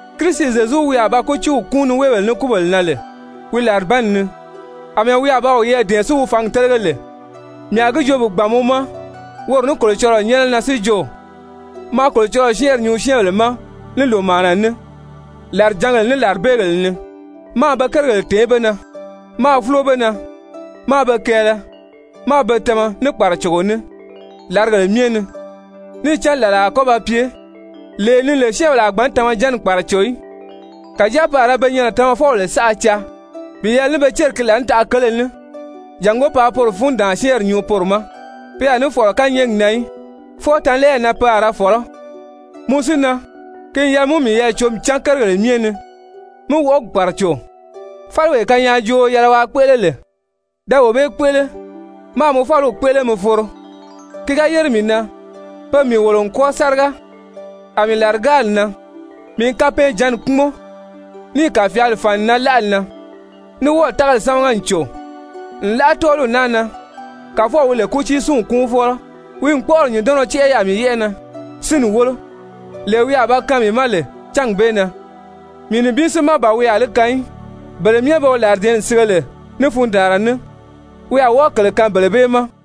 Kirisi Zyezu wi a ba kútiiw kúun niweebèle ní kúbèle na lè wi làribanni ni, àmɛɛ wi a ba wiyɛɛ dɛ̀ɛn si wi fǎngi télege lè, mii a gi joo gbàn mɔ ma woro ní Kolocɔlɔɔ nyɛ́nɛ na si jo, maa Kolocɔlɔɔ syɛ́ɛnri nyuu syɛ́ɛnbèle ma ní lòmaana ní, làrijǎngèle, ní làribeegèle ni, máā be kérigèle tèé be na, máā fúlo be na, máā be kɛɛlɛ, máā be tama ní kpàracogo ní làrigèle myɛ ni. Níì cán làla a kɔ́ ba pye, lee ni lè syɛ́ɛnbèle a gbǎn tamajanni kpàraco í. Kàjáa pe a ra pe nyɛnɛ tamafɔbèle saʔa caa bi yɛlɛ ní be céri ki laànitaʔa kele ní, jàngó paa poro fundaan-syɛ́ɛnri nyuu poro ma. Pe a ní fɔ̀lɔ kányɛɛgi na í, fwɔɔ tanlɛɛyi na pe a ra fɔ̀lɔ́. Mɔ si na, ki n yɛlɛ mɔ í miyɛɛ cǒmi cán kérigèle myɛ ni, mí wɔʔɔgi kpàraco, fáliwee kanyaajooo yɛlɛ waa kpéʔele lè, da wee bee kpéʔele, máā mɔ fáliw kpéʔele mi foro. Ki ga yére mii na, pe n mii wòlo n kwɔ́ɔ sáriga, a mii làrigárili nan. Mii n kapɛɛnjǎnni kpúmɔn, níì kàfyaali fàn n nan láʔali na, ní wɔ́ɔ̀ tágali sámaga n cò. Nlaʔa tɔ́ɔliw naa na, Kàfɔw wi lè kútiisinw kúunfɔlɔ, wi n kpɔ́ʔɔri nyùndɔnnɔ tɛ́ʔɛ yaà mii yɛ́ʔɛ na, sínni wólo, lee wi a ba kaan mii ma lè cángi bee na. Mii nibin si má ban wi a li kaan í, bele myɛ be wi làridɛ̀ɛ́nni sige lè ní fundaanra ní, wi a wɔ́ɔ kèle kaan bele bee ma.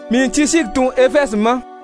Mii n Tisyiki tun Efɛzi ma.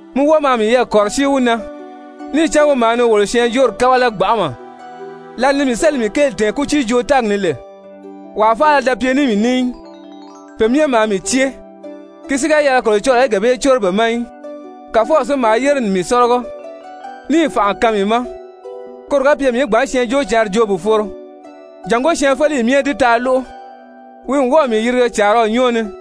Mi wɔ́ɔ maa miyɛɛ kɔ̀rɔsíi wi na, níì cán wi maa ni wolo syɛɛnjóori kábala gbanʔama. Lǎli ni mii sélì mii kéeli tɛ̀ɛn kútiijoo-tɛ́ɛgi ni lè, wàa faala da pye ní mii ní í, pe myɛ maa mii cée. Ki si ga yɛlɛ Kolocɔlɔɔ í gee bee córo be ma í! Kàfɔw si maa yére n mii sɔ́lɔgɔ níì fànʔa kaan mii ma, koro ga pye mii í gbǎn Syɛɛnjóocǎnri joo bi foro, jàngó syɛɛnfeleyi myɛ í di taa lóʔo. Wi n wɔ́ɔ̀ mii yirige càaraw nyɔ́ɔ ni.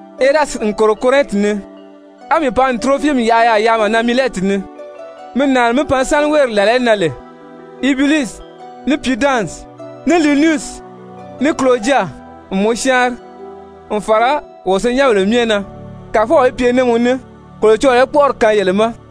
Erasiti n kòro Korɛnti ni, á mii pan n Turofimi yaʔa yaà yaama na Milɛti ni. Mi nàani mí pan sáni wéeri làla í nan lè. Ubulusi ní Pudansi, ní Linusi, ní Kuloja n mɔ syáanri n fàra wo senyɛnbèle myɛ na. Kàfɔw í pye ní mɔ ní. Kolocɔlɔɔ í kpɔ́ʔɔri kaan yele ma.